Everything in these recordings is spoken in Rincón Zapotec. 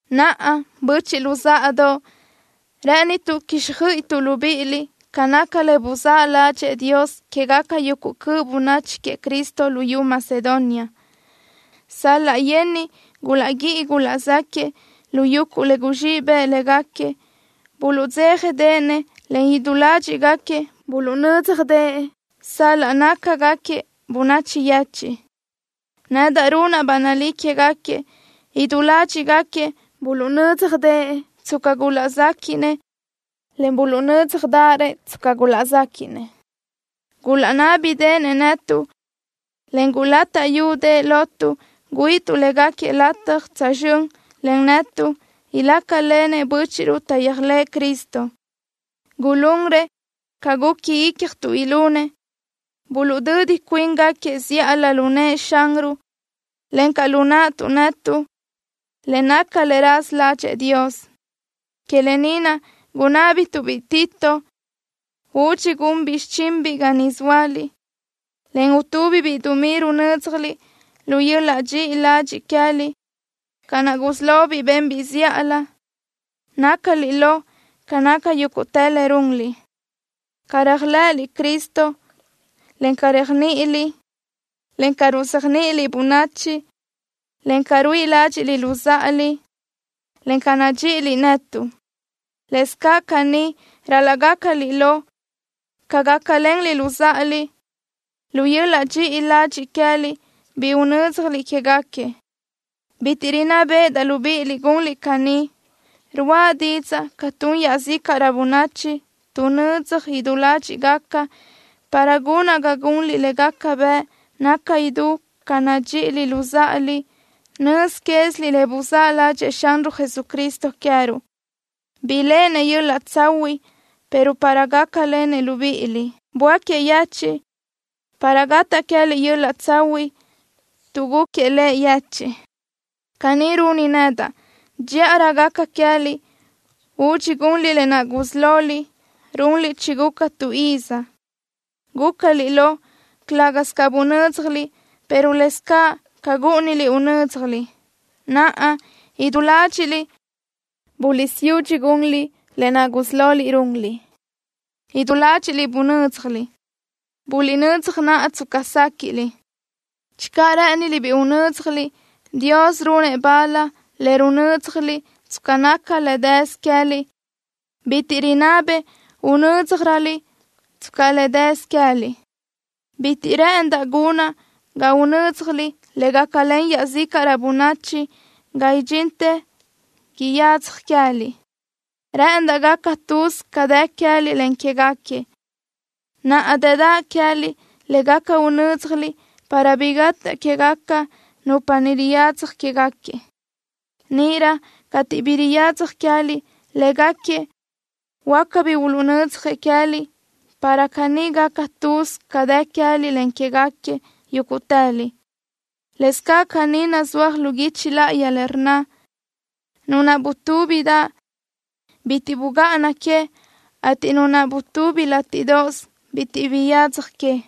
Naʼa, böchiʼ luzáʼadoʼ, rë́ʼënituʼ quíxjöiʼituʼ libíʼiliʼ ca naca le buzáʼ ládxëʼë Dios quégaca yuguʼ cöʼ bönachi queëʼ Cristo luyú Macedonia. Sal-laʼ yenniʼ gulaʼguíʼi gulaʼzáquiëʼ lu yuguʼ le guzxíʼ bëʼ légaquiëʼ, buluʼdzéjadeʼenëʼ, en idú ládxiʼgaquiëʼ buluʼnö́dzjadëʼë sal-laʼ nácagaquiëʼ bönachi yechiʼ. Nedaʼ runaʼ ba nalí quégaquiëʼ, idú ládxiʼgaquiëʼ buluʼnö́dzjadëʼë tsca gulaʼzéquiʼnëʼ, en buluʼnö́dzjarëʼ tsca gulaʼzéquiʼnëʼ. Gulaʼnábideʼenëʼ netuʼ, en gulátaʼyudëʼë lotuʼ güíʼituʼ légaquiëʼ lataj tsözxö́n len netuʼ ilácalenëʼ bö́chiʼruʼ taʼyéajlëʼë Cristo. Gulunrëʼ ca guqui ícjatuʼ ilunëʼ. Buluʼdödi cuíngaquiëʼ zíʼalö lu nëʼë Xanruʼ, encaʼ lu naʼtuʼ netuʼ, le naca le raza ládxëʼë Dios. Que lë ni naʼ gunábituʼ-biʼ biʼi Tito údxi gunbiʼ xichinbiʼ ga niʼ zóaliʼ, en utúbibiʼ dumí runö́dzjaliʼ lu yöl-laʼ dxiʼi ladxiʼ queë́liʼ, ca naʼ gusí lobiʼ benbiʼ zíʼalö. Nácaliʼ lo ca naca yúguʼtë le runliʼ, ca réajlëʼëliʼ Cristo, en ca réajniʼiliʼ, en ca ruzéajniʼiliʼ bönachi, en ca ruíʼi ládxiʼliʼ luzáʼaliʼ, encaʼ ca nadxíʼiliʼ netuʼ. Lëscaʼ caní ral-laʼ gácaliʼ lo ca gácalenliʼ luzáʼaliʼ, lu yöl-laʼ dxiʼi ladxiʼ queë́liʼ bi unö́dzjaliʼ quégaquiëʼ. Bitiʼ rinná béʼedaʼ libíʼiliʼ gunliʼ caní. Ruáʼa didzaʼ ca tun iaʼzícaʼrö bönachi, tuʼnödzaj idú ládxiʼgaca, para gunaʼ ga gunliʼ le gaca bëʼ naca idú ca nadxíʼiliʼ luzáʼaliʼ. Nöz quéziliʼ le buzáʼ ládxëʼë Xanruʼ Jesucristo queë́ruʼ. Biléʼenëʼ yöl-laʼ tsahuiʼ pero para gácalenëʼ libíʼiliʼ böáquiëʼ yechiʼ para gataʼ queë́liʼ yöl-laʼ tsahuiʼ, tuʼ gúquiëʼ Lëʼ yechiʼ. Caní runi nedaʼ: Dxíʼarö gaca queë́liʼ údxi gunliʼ lë naʼ gusí loliʼ runliʼ chiguca tu iz. Gúcaliʼ lo, calë́gasö ca bunö́dzjaliʼ, pero lëscaʼ ca gúʼuniliʼ unö́dzjaliʼ. Naʼa, idú ládxiʼliʼ buliʼsiyudxi gunliʼ lë naʼ gusí loliʼ runliʼ, idú ládxiʼliʼ bunö́dzjaliʼ. Buliʼnödzaj naʼa tsca séquiʼliʼ. Channö rë́ʼëniliʼ bi unö́dzjaliʼ, Dios runëʼ bal le runö́dzjaliʼ tsca naca le dësö queë́liʼ. Bitiʼ rinabëʼ unö́dzjaröliʼ tsca le dësö queë́liʼ. Bitiʼ rë́ʼëndaʼ gunaʼ ga unö́dzjaliʼ le gácalen iaʼzícaʼrö bönachi ga idxintë yadzaj queë́liʼ. Rë́ʼëndaʼ gaca tuz ca dë queë́liʼ, en quégaquiëʼ. Naʼa dëdaʼ queë́liʼ le gaca unö́dzjaliʼ para bi gataʼ quégaca nupa niʼ riyadzaj quéguequi. Níʼirö cateʼ bi yadzaj queë́liʼ, légaquiëʼ huáca bi uluʼnödzjëʼ queë́liʼ para caní gaca tuz ca dë queë́liʼ, en quégaquiëʼ yúguʼtëliʼ. Lëscaʼ caní nazúaj lu guichi láʼayi le rnna: “Nu naʼ butúbidaʼ, bitiʼ bugáʼana que, ateʼ nu naʼ butubi látiʼdoʼos, bitiʼ biyadzaj que.”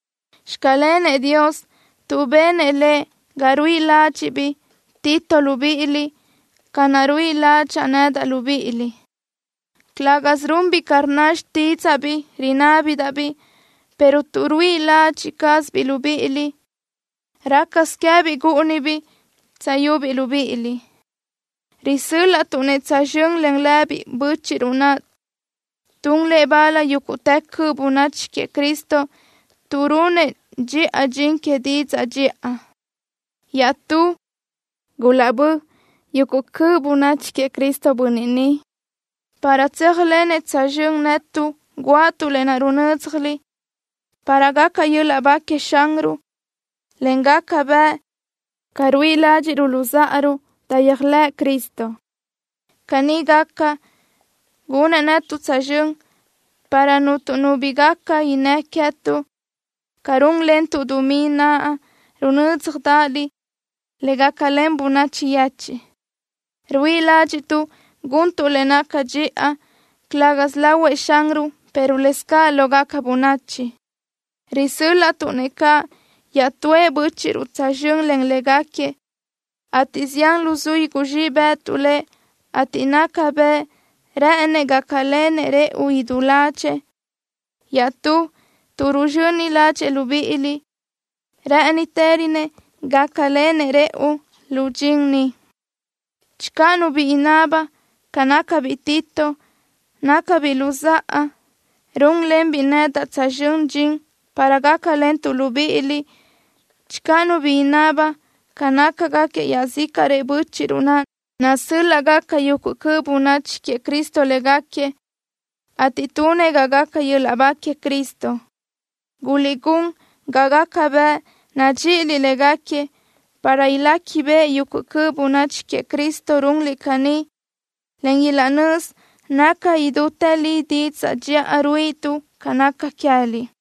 ¡Xclenëʼ Dios, tuʼ benëʼ Lëʼ ga ruíʼi ládxiʼbiʼ biʼi Tito libíʼiliʼ, ca naʼ ruíʼi ládxaʼa nedaʼ libíʼiliʼ! Calë́gasö runbiʼ ca rnna xtídzaʼa bi rinábidaʼ-biʼ, pero tuʼ ruíʼi ladxiʼ cázabiʼ libíʼiliʼ, rácasö queë́biʼ gúʼunibiʼ tsöyubiʼ libíʼiliʼ. Risö́l-laʼtuʼ-nëʼ tsözxö́n len lëbiʼ bö́chiʼruʼ naʼ tun lëʼ bal yúguʼtë cöʼ bönachi queëʼ Cristo, tuʼ runëʼ dxiʼa dxin que didzaʼ dxiʼa. Iaʼstú, gulaʼbö́ yuguʼ cöʼ bönachi queëʼ Cristo bönniʼ ni, para tséajlenëʼ tsözxö́n netuʼ guáʼatuʼ lë naʼ runö́dzjaliʼ, para gaca yöl-laʼ ba queëʼ Xanruʼ, en gaca bëʼ caʼ ruíʼi ládxiʼruʼ luzáʼaruʼ taʼyéajlëʼë Cristo. Caní gaca, gunëʼ netuʼ tsözxö́n para cuntu nu bi gaca innë́ queë́tuʼ, ca rúnlentuʼ dumí naʼ runö́dzjadaʼaliʼ, le gácalen bönachi yechiʼ. Ruíʼi ládxiʼtuʼ guntuʼ le naca dxiʼa, calë́gasö lahuëʼ Xanruʼ, pero lëscaʼ lógaca bönachi. Risö́l-laʼtuʼ-nëʼ caʼ iaʼtúëʼ bö́chiʼruʼ tsözxö́n len légaquiëʼ, ateʼ zián luzuí guzxíʼ bë́ʼëtuʼ lëʼ, ateʼ naca bëʼ rë́ʼënëʼ gácalenëʼ rëʼu idú ládxëʼë. Iaʼstú, tuʼ ruzxöni ládxëʼë libíʼiliʼ, rë́ʼënitërönëʼ caʼ gácalenëʼ rëʼu lu dxin ni. Channö nu bi inaba ca nácabiʼ biʼi Tito, nácabiʼ luzáʼa, rúnlenbiʼ nedaʼ tsözxö́n dxin para gácalentuʼ libíʼiliʼ. Channö nu bi inaba ca nácagaquiëʼ iaʼzícaʼrëʼ bö́chiʼruʼ naʼ, nasö́l-laʼgaca yuguʼ cöʼ bönachi queëʼ Cristo légaquiëʼ, ateʼ tunëʼ ga gaca yöl-laʼ ba queëʼ Cristo. Guliʼgún ga gaca bëʼ nadxíʼiliʼ légaquiëʼ para iléquibeʼe yuguʼ cöʼ bönachi queëʼ Cristo runliʼ caní, en ilaʼnözi naca idútë li didzaʼ dxiʼa ruíʼituʼ ca naca queë́liʼ.